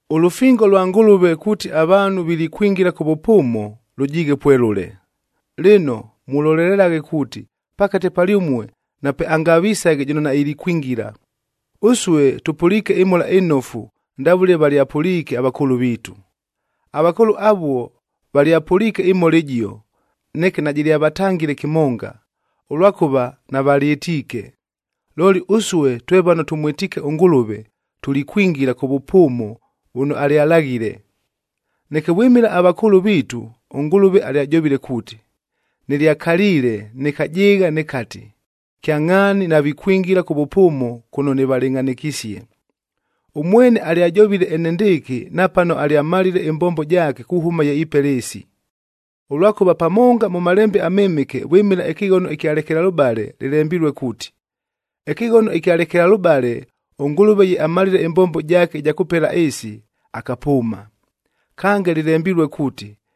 Ʉlʉfingo lwa Ngʉlʉve kuuti avaanhu vilikwingila kʉ vʉpʉʉmo, lʉjiighe pwelʉle. Lɨno, mulolelelaghe kuuti pakate palyʉmue napeangavisaghe jʉno nailikwingila. Ʉsue tʉpʉliike ɨMhola ɨNofu ndavʉle valyapʉliike avakʉʉlʉ viitu. Avakʉʉlʉ avuo valyapʉliike ɨMhola ɨjio, neke najɨlyavatangile kɨmonga, ʉlwakʉva navalyɨtiike. Looli ʉsue twe vano tʉmwɨtiike ʉNgʉlʉve, tulikwingila kʉ vʉpʉʉmo vʉno alyalaghile. Neke vwɨmɨla avakʉʉlʉ viitu ʉNgʉlʉve alyajovile kuuti, “Nɨlyakaliile, nɨkajɨɨgha nɨkati, ‘Kyangʼhaani navikwingila kʉ vʉpʉʉmo kʉno nɨvalɨngʼhanɨkisie.’”a Ʉmwene alyajovile enendɨɨkɨ napano alyamalile ɨmbombo jaake kuhʉma ye ipela ɨɨsi. Ʉlwakʉva pamonga mʉ Malembe aMɨmɨke vwɨmɨla ɨkɨghono ɨkya lekelalʉbale lɨlembilue kuuti, “Ɨkɨghono ɨkya lekelalʉbale ʉNgʉlʉve ye amalile ɨmbombo jaake ɨja kʉpela ɨɨsi, Kange lɨlembilue kuuti,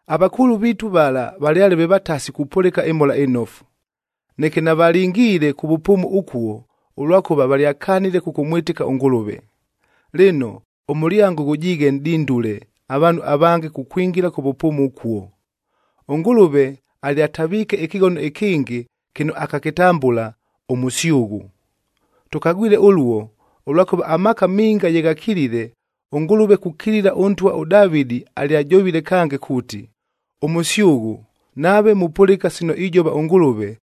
Avakʉʉlʉ viitu vala valyale ve vatasi kupʉlɨka ɨMhola ɨNofu. Neke navalingiile kʉ vʉpʉʉmo ʉkuo, ʉlwakʉva valyakanile kʉkʉmwɨtɨka ʉNgʉlʉve. Lɨno, ʉmʉlyango ghʉjiighe nʼdindule avaanhu avange kukwingila kʉ vʉpʉʉmo ʉkuo. ɄNgʉlʉve alyataviike ɨkɨghono ɨkɨngɨ kɨno akakɨtambʉla, “Ʉmʉsyʉghʉ.” Tʉkagwile ʉluo, ʉlwakʉva amaaka minga ye ghakilile, ʉNgʉlʉve kukilila ʉntwa ʉDavɨdid alyajovile kange kuuti, “Ʉmʉsyʉghʉ, nave mupʉlɨka sino ijova ʉNgʉlʉve,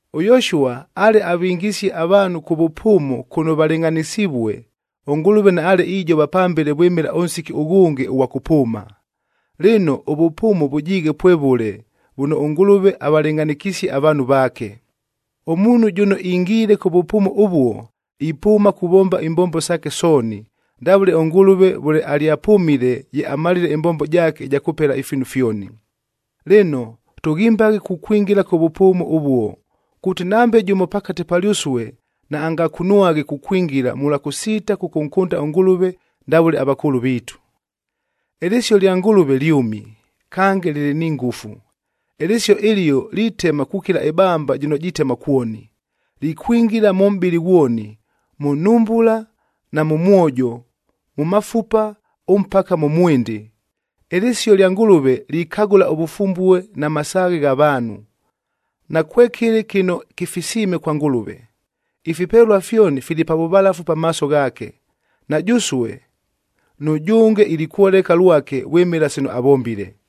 ɄYoshua ale avingisie avaanhu kʉ vʉpʉʉmo kʉno valɨngʼhanɨsivue,f ʉNgʉlʉve naale ijova pambele vwɨmɨla ʉnsiki ʉghʉnge ʉghwa kʉpʉʉma. Lɨno, ʉvʉpʉʉmo vʉjiighe pwevʉle vʉno ʉNgʉlʉve avalɨngʼhanɨkisie avaanhu vaake. Ʉmuunhu jʉno ingiile kʉ vʉpʉʉmo ʉvuo, ipʉʉma kuvomba imbombo saake sooni, ndavʉle ʉNgʉlʉve vʉle alyapʉmile ye amalile ɨmbombo jaake ɨja kʉpela ifiinu fyoni. Lɨno, tʉghimbaghe kukwingila kʉ vʉpʉʉmo ʉvuo, kuuti nambe jʉmo pakate palyʉsue naangakunwaghe kukwingila mʉlwa kʉsiita kʉkʉnkʉnda ʉNgʉlʉve ndavʉle avakʉʉlʉ viitu. Ɨlɨsio lya Ngʉlʉve lyʉmi, kange lɨlɨ ni ngʉfu. Ɨlɨsio ɨlio litema kukila ɨbamba jɨno jitema kwoni. Likwingila mʉ mʼbɨlɨ ghwoni: mʉ nhumbula na mʉ mwojo, mʉ mafupa ʉmpaka mʉ mwɨndɨ. Ɨlɨsio lya Ngʉlʉve likagʉla ʉvʉfumbue na masaaghe gha vaanhu. Nakwekɨlɨ kɨno kɨfisiime kwa Ngʉlʉve. Ifipelua fyoni fili pa vʉvalafu pamaaso ghaake. Na jʉsue, nʉjʉnge ilikwoleka lwake vwɨmɨla sino avombile.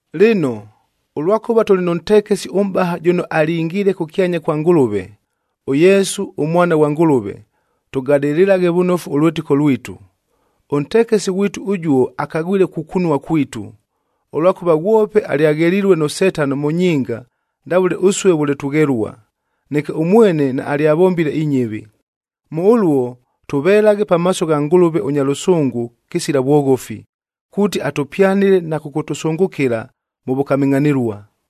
Lɨno, ʉlwakʉva tʉlɨ nʉ ntekesi ʉmʼbaha jʉno alingiile kʉkyanya kwa Ngʉlʉve, ʉYesu ʉMwana ghwa Ngʉlʉve, tʉgadɨlɨlaghe vʉnofu ʉlwɨtɨko lwitu. Ʉntekesi ghwitu ʉjuo akagwile kukunua kwitu, ʉlwakʉva ghwope alyaghelilue nʉ Setano mʉ nyinga ndavʉle ʉsue vʉle tughelua. Neke ʉmwene naalyavombile inyɨvi. Mʉ ʉluo, tʉvelaghe pamaaso gha Ngʉlʉve ʉnya lʉsʉngʉ kɨsila vwoghofi, kuuti atʉpyanɨle na kʉkʉtʉsʉngʉkɨla mʉ vʉkamɨngʼhanɨlua.